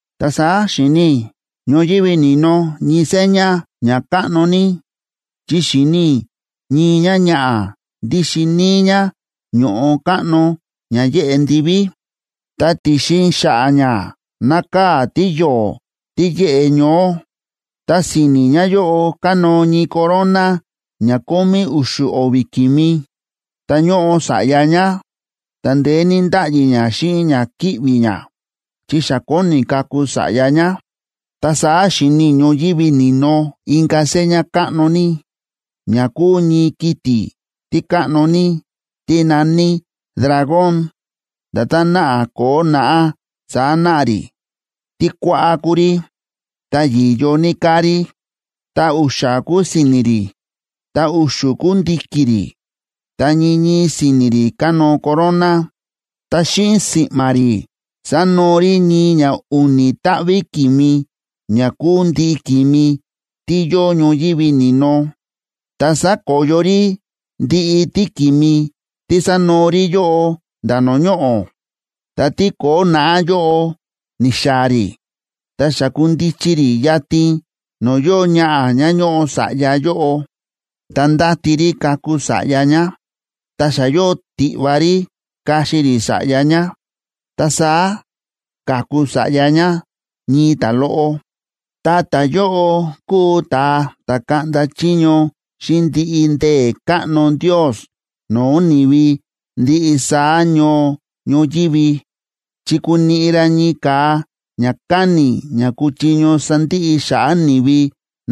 Ta saá xi̱ni i̱ ñoyívi ni̱no ñii seña ña káꞌno ní, chi xi̱ni i̱ ñii ñáñaꞌa̱, ndíxin níí ñá ño̱ꞌo káꞌno ña yéꞌe ndiví, ta ti̱xin xa̱ꞌa̱ ñá nákaa̱ tíyo̱o̱ tí yéꞌe ñoó, ta si̱ni̱ ñáyóꞌo kánóo ñii corona ña kómí u̱xu̱ o̱vi̱ ki̱mi. Ta ñóꞌo sa̱ꞌya ñá, ta ndeé ní ndáꞌyi ñá xíꞌin ña kíꞌvi̱ ñá, chi xa kóni kaku sa̱ꞌya ñá. Ta saá xi̱ni i̱ ñoyívi ni̱no inka̱ seña káꞌno ní, ña kúu ñii kiti̱ tí káꞌno ní, tí na̱ní dragón. Nda̱tán náꞌa ko̱o̱ naꞌá, saá náꞌa rí. Tí kuáꞌá kúu rí, ta yi̱yo ní káa rí, ta u̱xa̱ kúu si̱ni̱ rí, ta u̱xu̱ kúu ndi̱ki̱ rí, ta ñii ñii si̱ni̱ rí kánóo corona. Ta xíꞌin si̱ꞌma̱ rí sa̱noo rí ñii ña u̱ni̱ táꞌví ki̱mi ña kúu ndiꞌi ki̱mi tí yóo ñoyívi ni̱no, ta sa̱koyo rí ndiꞌi tíki̱mi tí sa̱noo rí yóꞌo nda̱ no̱o̱ ñoꞌo̱. Ta tíko̱o̱ naꞌá yóꞌo ni̱xaa̱ rí, ta xi̱kundichi rí yatin no̱o̱ yóo ñaꞌa̱ ñá ñóꞌo sa̱ꞌya yóꞌo, ta ndáti rí kaku sa̱ꞌya ñá, ta xa yóo tiꞌva rí kaxi rí sa̱ꞌya ñá. Ta saá ka̱ku sa̱ꞌya ñá, ñii ta̱loꞌo, ta ta̱yóꞌo kuu ta̱a ta̱ kaꞌnda chiño xíꞌin ndiꞌi ndee̱ káꞌno Ndios no̱o̱ ni̱vi ndiꞌi saá ñoo ñoyívi chi kuniꞌi ra ñii ka̱a ña káni̱ ña kuchiño sandiꞌi xa̱ꞌa̱ ni̱vi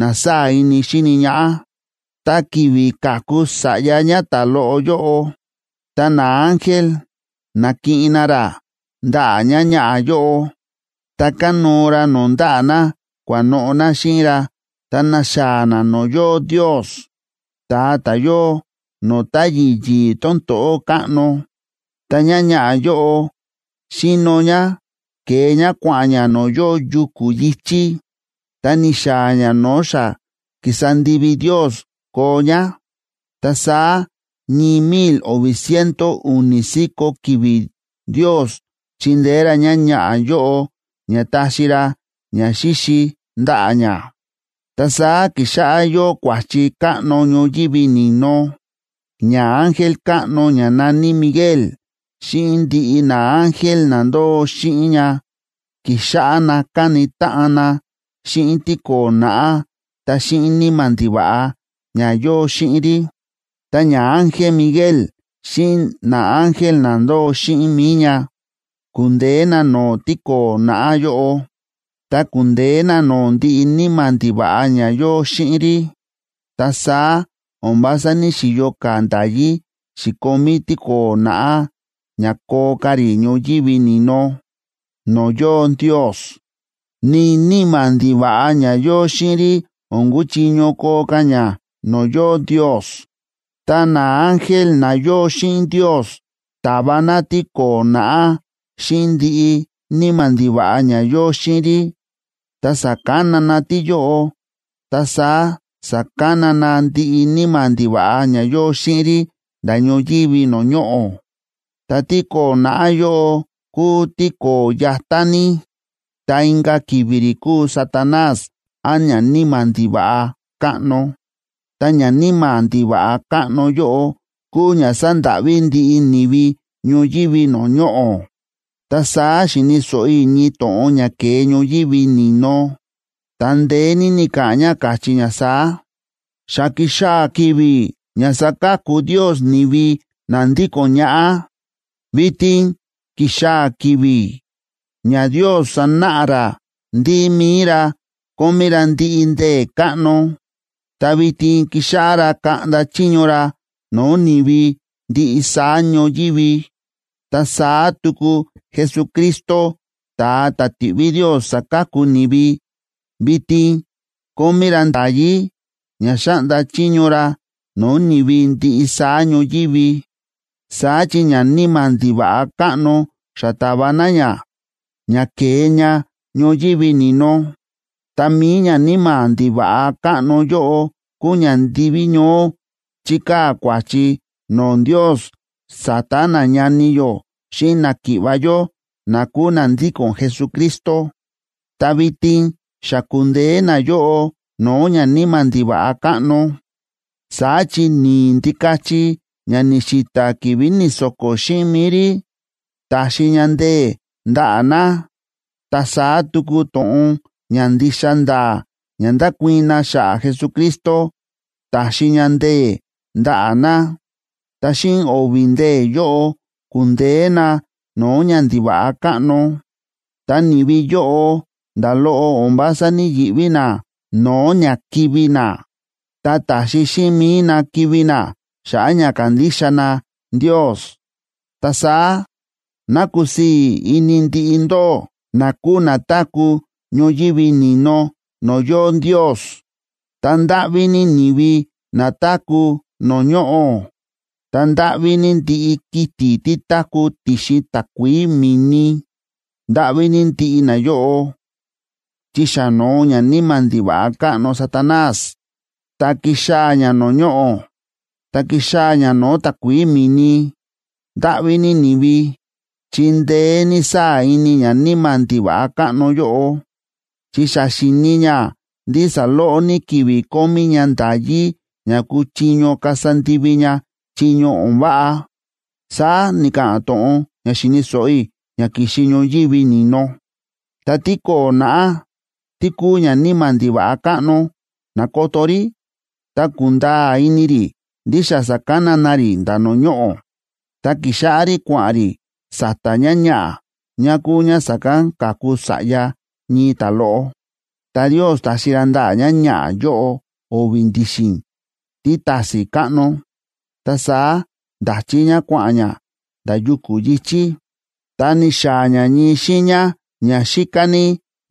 na sáa̱ ini xíni ñaꞌá. Ta ki̱vi̱ ka̱ku sa̱ꞌya ñá ta̱loꞌo yóꞌo, ta naángel na̱kiꞌin na ra ndaꞌa̱ ñáñaꞌa̱ yóꞌo, ta kánóo ra no̱o̱ ndaꞌa̱ na kua̱noꞌo̱ na xíꞌin ra ta na̱xaa̱ na no̱o̱ yóo Ndios, ta̱a ta̱ yóo no̱o̱ táyi̱ yi̱i̱ tón to̱ꞌó káꞌno. Ta ñáñaꞌa̱ yóꞌo xi̱no ñá, ke̱e ñá kua̱ꞌa̱n ñá no̱o̱ yóo yuku̱ yi̱chí, ta ni̱xaa̱ ñá no̱o̱ xa ki̱sa ndivi Ndios koo ñá. Ta saá ñii mil o̱vi̱ ciento u̱ni̱ si̱ko̱ ki̱vi̱ Ndios chi̱ndeé ra ñáñaꞌa̱ yóꞌo, ña ta̱xi ra ñaxíxi ndaꞌa̱ ñá. Ta saá ki̱xáꞌá yóo kua̱chi káꞌno ñoyívi ni̱no. Ñaángel káꞌno ña na̱ní Miguel, xíꞌin ndiꞌi naángel na ndóo xíꞌin ña, ki̱xáꞌá na káni táꞌan na xíꞌin tíko̱o̱ naꞌá ta xíꞌin níma̱ ndiva̱ꞌa ña yóo xíꞌin rí. Ta ñaángel Miguel xíꞌin naángel na ndóo xíꞌin mi̱i ña, ku̱ndeé na no̱o̱ tíko̱o̱ naꞌá yóꞌo, ta ku̱ndeé na no̱o̱ ndiꞌi níma̱ ndiva̱ꞌa ña yóo xíꞌin rí. Ta saá o̱n vása ní‑xiyo ka̱ nda̱yí xi̱komí tíko̱o̱ naꞌá ña koo ka̱ rí ñoyívi ni̱no no̱o̱ yóo Ndios, ni níma̱ ndiva̱ꞌa ña yóo xíꞌin rí o̱n kuchiño koo ka̱ ña no̱o̱ yóo Ndios. Ta naángel na yóo xíꞌin Ndios ta̱va na tíko̱o̱ naꞌá xíꞌin ndiꞌi níma̱ ndiva̱ꞌa ña yóo xíꞌin rí, ta sa̱kana na tíyóꞌo ta saá sa̱kana na ndiꞌi níma̱ ndiva̱ꞌa ña yóo xíꞌin rí nda̱ ñoyívi no̱o̱ ñoꞌo̱. Ta tíko̱o̱ naꞌá yóꞌo kúu tíko̱o̱ yatá ní, ta inka̱ ki̱vi̱ rí kúu Satanás án ñaníma̱ ndiva̱ꞌa káꞌno. Ta ñaníma̱ ndiva̱ꞌa káꞌno yóꞌo kúu ña sándáꞌví ndiꞌi ni̱vi ñoyívi no̱o̱ ñoꞌo̱. Ta saá xi̱ni̱ so̱ꞌo i̱ ñii to̱ꞌon ña ke̱e ñoyívi ni̱no, ta ndeé ní ni̱ka̱ꞌa̱n ña, káchí ña saá: ―Xa ki̱xaa̱ ki̱vi̱ ña saka̱ku Ndios ni̱vi na ndíko̱n ñaꞌá. Vitin ki̱xaa̱ ki̱vi̱ ña Ndios sanáꞌa ra ndí mi̱i ra kómí ra ndiꞌi ndee̱ káꞌno, ta vitin kixáꞌá ra kaꞌnda chiño ra no̱o̱ ni̱vi ndiꞌi saá ñoyívi. Ta saá tuku Jesucristo, ta̱a ta̱ ti̱ꞌví Ndios saka̱ku ni̱vi, vitin kómí ra nda̱yí ña xáꞌnda chiño ra no̱o̱ ni̱vi ndiꞌi saá ñoyívi. Saá chi ñaníma̱ ndiva̱ꞌa káꞌno, xa ta̱va na ña, ña ke̱e ña ñoyívi ni̱no. Ta mi̱i ñaníma̱ ndiva̱ꞌa káꞌno yóꞌo kúu ña ndiví ñoó chíkaa̱ kua̱chi no̱o̱ Ndios sa̱ta̱ nañani yó xíꞌin náki̱ꞌva̱ yó na kúu na ndíko̱n Jesucristo. Ta vitin xa ku̱ndeé nayóꞌo no̱o̱ ñaníma̱ ndiva̱ꞌa káꞌno. Saá chi ni̱i̱ Ndikachi ña ni̱xi̱ta̱ ki̱vi̱ ni̱so̱ko̱ xíꞌin mi̱i rí, ta̱xi ña ndee̱ ndaꞌa̱ na. Ta saá tuku to̱ꞌon ña ndixa nda̱a̱ ña nda̱kuii̱n na xa̱ꞌa̱ Jesucristo, ta̱xi ña ndee̱ ndaꞌa̱ na, ta xíꞌin o̱vi̱ ndee̱ yóꞌo, ku̱ndeé na no̱o̱ ñandiva̱ꞌa káꞌno. Ta ni̱vi yóꞌo, nda̱ loꞌo o̱n vása ní‑yiꞌví na no̱o̱ ña kivi̱ na, ta ta̱xi xíꞌin mi̱i na kivi̱ na xa̱ꞌa̱ ña kándixa na Ndios. Ta saá, ¡ná kusii̱ ini ndiꞌi ndóꞌó, na kúu na táku̱ ñoyívi ni̱no no̱o̱ yóo Ndios! ¡Ta ndáꞌví ní ni̱vi na táku̱ no̱o̱ ñoꞌo̱! ¡Ta ndáꞌví ní ndiꞌi kiti̱ tí táku̱ ti̱xin takuií mi̱ni! Ndáꞌví ní ndiꞌi nayóꞌo, chi xa no̱o ñaníma̱ ndiva̱ꞌa káꞌno Satanás, ta ki̱xaa̱ ña no̱o̱ ñoꞌo̱, ta ki̱xaa̱ ña no̱o̱ takuií mi̱ni. Ndáꞌví ní ni̱vi, chi ndeé ní sáa̱ ini ñaníma̱ ndiva̱ꞌa káꞌno yóꞌo, chi xa xíni̱ ña ndí saloꞌo ní ki̱vi̱ kómí ña nda̱yí ña kúchiño kasa ndivi ña chiño o̱n váꞌa ―saá ni̱ka̱ꞌa̱n to̱ꞌon ña xi̱ni̱ so̱ꞌo i̱, ña ki̱xi ñoyívi ni̱no. Tá tíko̱o̱ naꞌá, tí kúu ñaníma̱ ndiva̱ꞌa káꞌno, na̱koto rí ta ku̱nda̱a̱ ini rí ndí xa sa̱kana na rí nda̱ no̱o̱ ñoꞌo̱, ta ki̱xáꞌá rí kua̱ꞌa̱n rí sa̱ta̱ ñáñaꞌa̱, ñá kúu ñá sa̱kán ka̱ku sa̱ꞌya ñii ta̱loꞌo. Ta Ndios ta̱xi ra ndaꞌa̱ ñáñaꞌa̱ yóꞌo o̱vi̱ ndi̱xi̱n títa̱si̱n káꞌno, ta saá nda̱chí ñá kua̱ꞌa̱n ñá nda̱ yuku̱ yi̱chí, ta ni̱xaa̱ ñá ñii xiiña ña xíká ní,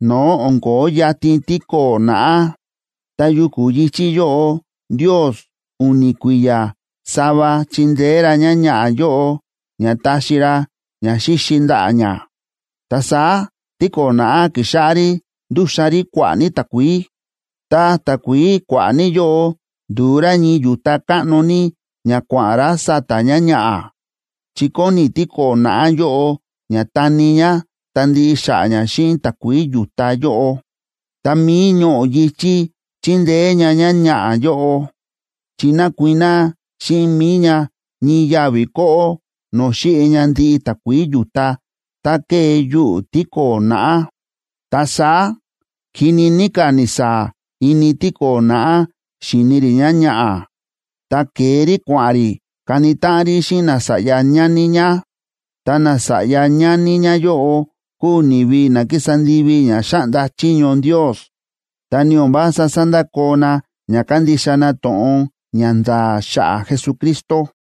no̱o̱ o̱n ko̱ó yatin tíko̱o̱ naꞌá. Ta yuku̱ yi̱chí yóꞌo Ndios u̱ni̱ kui̱ya̱ sava chi̱ndeé ra ñáñaꞌa̱ yóꞌo, ña ta̱xi ra ñaxíxi ndaꞌa̱ ñá. Ta saá tíko̱o̱ naꞌá ki̱xáꞌá rí ndúxan rí kua̱ꞌa̱ ní takuií, ta takuií kua̱ꞌa̱ ní yóꞌo ndu̱u rá ñii yu̱ta káꞌno ní ña kua̱ꞌa̱n rá sa̱ta̱ ñáñaꞌa̱, chi kóni tíko̱o̱ naꞌá yóꞌo ña tani ñá ta ndiꞌi xa̱ꞌa̱ ñá xíꞌin takuií yu̱ta yóꞌo. Ta mi̱i ñoꞌo̱ yi̱chí chi̱ndeé ña ñáñaꞌa̱ yóꞌo, chi na̱kuiná xíꞌin mi̱i ña ñii yavi̱ kóꞌó no̱o̱ xi̱ꞌi ña ndiꞌi takuií yu̱ta tá ke̱e yuꞌu̱ tíko̱o̱ naꞌá. Ta saá kini ní ka̱ ni̱saa̱ ini tíko̱o̱ naꞌá xíni rí ñáñaꞌa̱, ta ke̱e rí kua̱ꞌa̱n rí kani táꞌan rí xíꞌin nasa̱ꞌya ñani ñá. Ta nasa̱ꞌya ñani ñáyóꞌo kúu ni̱vi na kísa ndivi ña xáꞌnda chiño Ndios, ta ni o̱n vása sándakoo na ña kándixa na to̱ꞌon ña nda̱a̱ xa̱ꞌa̱ Jesucristo.